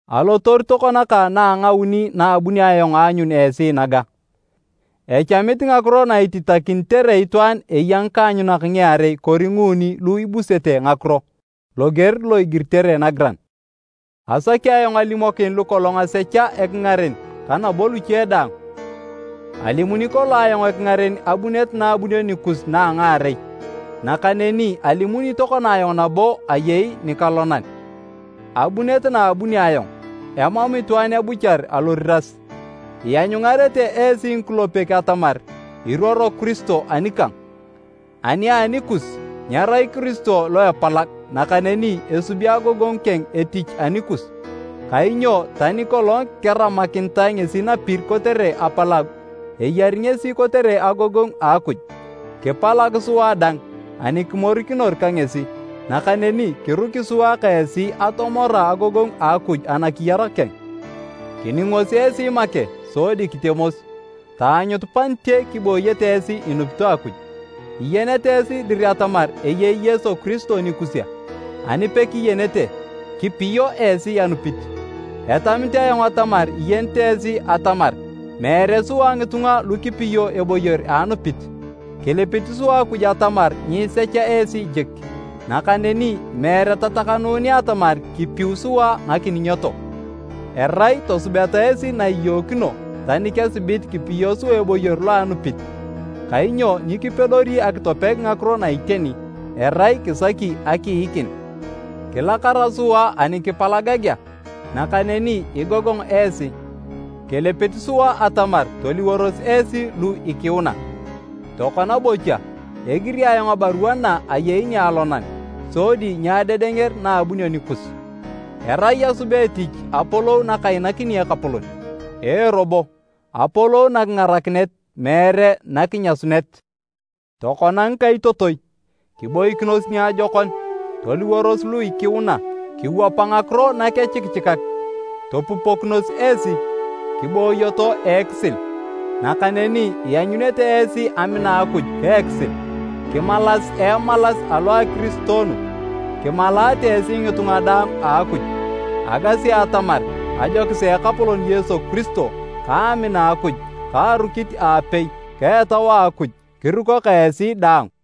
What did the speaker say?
Alotoru tokona kang na a ngauni naabunio ayong aanyun esi naga. “Echamit ngakiro na ititakinitere itwaan eya ngikaanyunak ngiarei kori nguuni lu ibusete ngakiro”, loger lo igiritere nagiran. Asaki ayong alimokin lukolong asecha ekingaren ka nabo luche daang, alimuni kolong ayong ekingaren abunet naabunio nikus na a ngaarei, nakaneni alimuni tokona ayong nabo ayei nikalonan. Abunet naabunio ayong, emam itwaan ebuchar aloriras. Ianyungarete esi ngikulepek atamar iruoro Kiristo anikang. Ani anikus, nyerai Kiristo lo epalag nakaneni esubi agogongu keng etich anikus. Kainyo tani kolong keramakinitae ngesi napir kotere apalagu, eyari ngesi kotere agogongu a Akuj. Kipalag sua dang ani kimorikinor ka ngesi, nakaneni kiruki sua ka esi atomora agogongu a Akuj anakiyar keng. Kiningos esi make sodi kitemos, taanyut panite kibooyete esi inupito Akuj. Iyenete esi dir atamar eyei Yesu Kiristo nikus a? Ani pekiyenete, kipiyo esi anupit. Etamit ayong atamar iyenete esi atamar meere sua ngitunga lu kipiyo eboyor a anupit. Kilipit sua Akuj atamar nyiisecha esi jik, nakaneni meere tatakanunea atamar kipiu sua ngakiningito. Erai tosubeta esi na iyookino tani kesibit kipiyo sua eboyor lo a anupit. Kainyo nyikipedori akitopeg ngakiro na iteni, erai kisaki akiikin. Kilakara sua ani kipalagagea, nakaneni igogong esi, Kilipit sua atamar toliworos esi lu ikiuna. Tokona bocha, egiri ayong abarua na ayei nialonan, sodi nyeadedenger na abunio nikus, erai asubea etich apolou nakainakini Ekapolon. Ee robo, apolou nakingarakinet meere nakinyasunet. Tokona ngikaitotoi, kiboikinos niajokon! Toliworos lu ikiuna, kiwapa ngakiro nakechikichikak, topupokinos esi, kibooyoto a ekisil. Nakaneni ianyunete esi amina a Akuj ka ekisil. Kimalas a emalas alo a ekiristoonu. Kimalaate esi ngitunga daang a Akuj. Agasi atamar ajokis a Ekapolon Yesu Kiristo, ka amina a Akuj ka arukit aapei ka Etau a Akuj, kiruko ka esi daang.